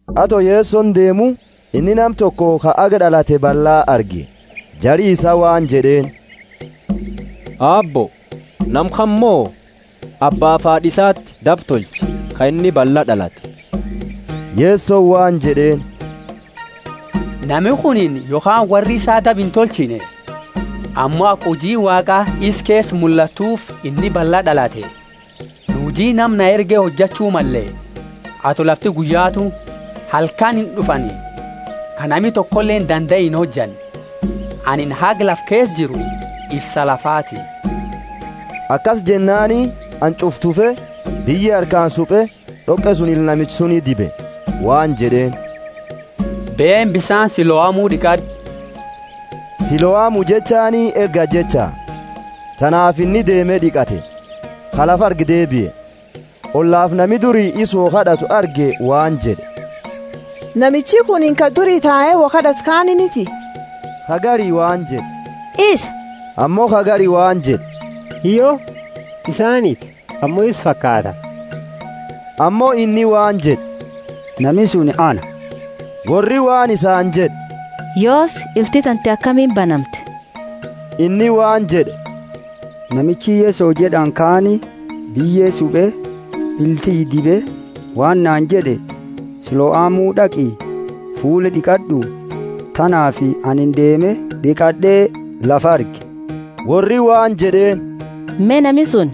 Ato Yesoni deemu, inni nama toko ka haga d'alate balla arge. Jari isaa waan jed'eeni, Aabbo, nama kana mo abbaafi haad'a isati daba tolche, ka inni ballaa d'alate? Yesoni waan jed'eeni, Nami kunini yokhaani worri isaa daba intolchine; ammo aka hujiini Waaqa isa keesa mullattuufi inni ballaa d'alate. Nu huji nama na erge hojachu malle, ato lafti guyyaatu; halkani ind'ufani, ka nami tokoleeni dandae inhojanne. Anini haga lafa keesa jiru ifsa lafaati. Akasi jennaani, hanch'ufa tufe, biyye harkaani supe, d'oqe suni ila namicha suni dibe waan jed'eeni, Beeni, bisaani Siloamu d'iqad'u. (Siloamu jechaani Erga jecha.) Tanaafi inni deeme d'iqate, ka lafa argu deebie. Ollafi nami duri isa wo kad'atu arge waan jed'e, Namichi kunini ka duri tae wo kad'atu kaaniiniti? Ka gari waan jed'e, Isa; ammo ka gari waan jed'e, Hiyyo, isaaniti, ammo isa fakaata. Ammo inni waan jed'e, Nami suni ana. Worri waan isaani jed'e, Yoosi, ilti tante akamiini banamte? Inni waan jed'e, Namichi Yeso jed'ani kaani biyye supe, ila tiyya dibe waan naani jed'e, Siloamu d'aqi, fuula d'iqad'u. Tanaafi ani deeme d'iqad'e lafa arge. Worri waan jed'eeni, Me, nami suni?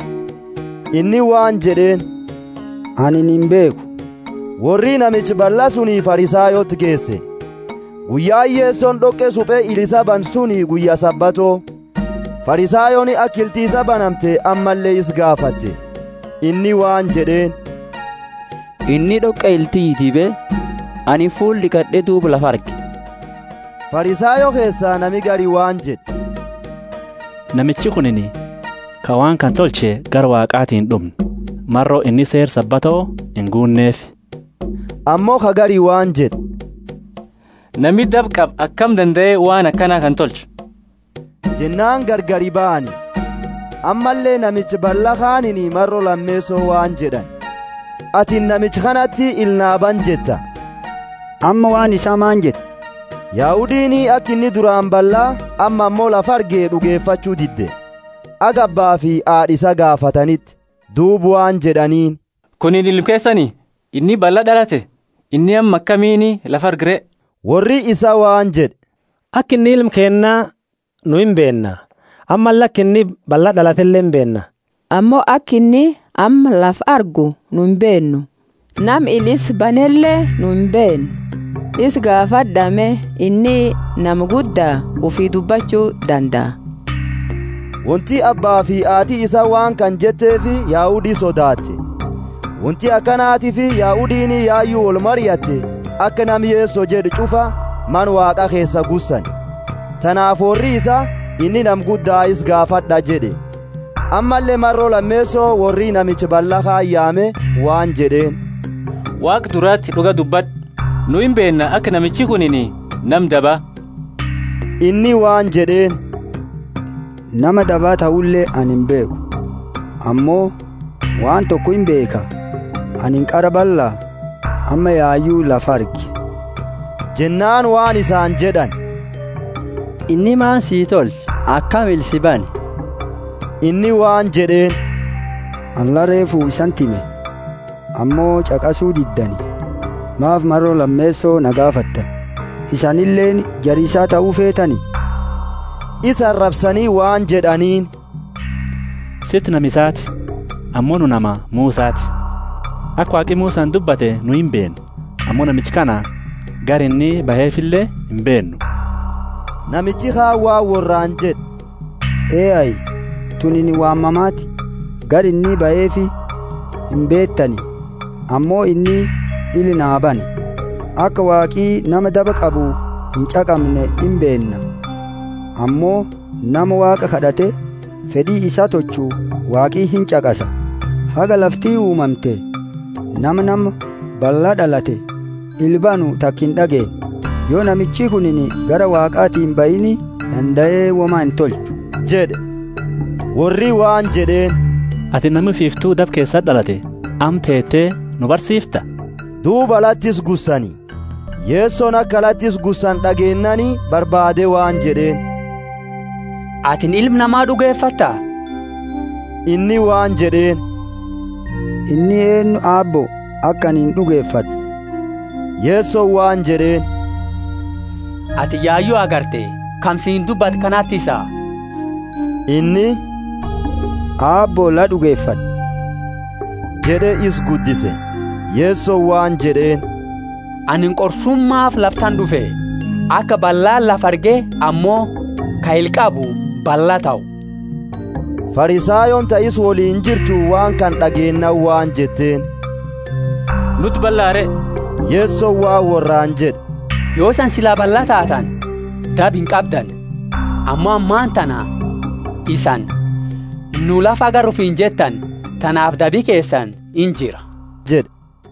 Inni waan jed'eeni, Anini imbeekhu. Worri namicha balla suni Farisayooti geese. Guyyaani Yesoni d'oqe supe ila isa bane suni guyya Sabato. Farisayooni aka ilti isaa banamte ammalle isa gaafate. Inni waan jed'eeni, Inni d'oqe ila tiyya dibe, anini fuula d'iqad'e, duuba lafa arge. Farisayo keesa nami gari waan jed'e, Namichi kunini, ka waan kana tolche, gara Waaqaati ind'umne, maro inni seera Sabato inguunneefi. Ammo ka gari waan jed'e, Nami daba qabu akami dandae waan akana kana tolcha? Jennaani gargari bahani. Ammalle namicha balla kaaniini maro lameeso waan jed'ani, atini namicha kanati ila naa bane jetta, amma waan isaa maani jetta? Yahudiini aka inni duraani balla, amma ammo lafa arge d'ugefachu didde, haga abbaafi haad'a isaa gaafataniti. Duuba waan jed'aniini, Kunini ilma keesani? Inni balla d'alate? Inni amma akamiini lafa arga re? Worri isaa waan jed'e, Aka inni ilma keenna nu imbeenna, ammalle aka inni balla d'alatele imbeenna. Ammo aka inni amma lafa argu nu imbeennu, nama ila isaa banele nu imbeennu; isa gaafad'a me, inni nama gudda, ufii dubbachu dandaa. Wonti abbaafi haati isaa waan kana jetteefi Yahudi sodaate; wonti akanatiifi Yahudiini yayu wolmariatte aka nama Yeso jed'u ch'ufa Mana Waaqa keesa gussani. Tanaafi worri isaa, Inni nama gudda, isa gaafad'a jed'e. Ammalle maro lameeso worri namicha balla kaani yaame waan jed'eeni, Waaqa durati d'uga dubbad'u! Nu imbeenna aka namichi kunini nama daba. Inni waan jed'eeni, Nama daba tahule ani imbeekhu. Ammo waan toko imbeekha; anini qara balla, amma yayu lafa arge. Jennaani waan isaani jed'ani, Inni maani sii tolche? Akami ila sii bane? Inni waan jed'eeni, Ani la reefu isaniti hime, ammo ch'aqasu diddani. Maafi maro lameeso na gaafattani? Isanileeni jara isaa tahu feetani? Isa arabsani waan jed'aniini, Siti nama isaati, ammo nu nama Musati. Aka Waaqi Musani dubbate nu imbeenna; ammo namicha kana gari inni bahefile imbeennu. Namichi kaani waan worraani jed'e, Ehayi, tunini waan mamaati! Gara inni bahefi imbeetani ammo inni ila naa bane! Aka Waaqi nama daba qabu inch'aqamne imbeenna; ammo nama Waaqa kad'ate fed'i isaa tolchu Waaqi inch'aqasa. Haga lafti uumamte, nama nama balla d'alate ila banu taka ind'ageenne. Yo namichi kunini gara Waaqaati imbahiini dandae woma intolchu jed'e. Worri waan jed'eeni. Atini nami ufiiftu daba keesati d'alatte, amma teete nu barsiifta? Duuba alati isa gussani. Yesoni aka alati isa gussani d'ageennaani barbaade waan jed'eeni, Atini Ilma Nama d'ugefatta? Inni waan jed'eeni, Inni eennu, Aabbo, aka anini d'ugefad'u? Yesoni waan jed'eeni, Ati yayu agarte, kama siini dubbatu kanati isa. Inni, Aabbo, la d'ugefad'e jed'e, isa guddise. Yesoni waan jed'eeni, Anini qorsumaafi lafa tana d'ufe, aka ballaani lafa arge ammo ka ila qabu ballaa tahu. Farisayooni ta isa woliini jirtu waan kana d'ageennaani waan jetteeni, Nuti balla re? Yesoni waan worraani jed'e, Yo isani sila balla taatani, daba inqabdani; ammo ammatana isani, Nu lafa agarra ufiini jetteeni, tanaafi dabi keesani injira jed'e.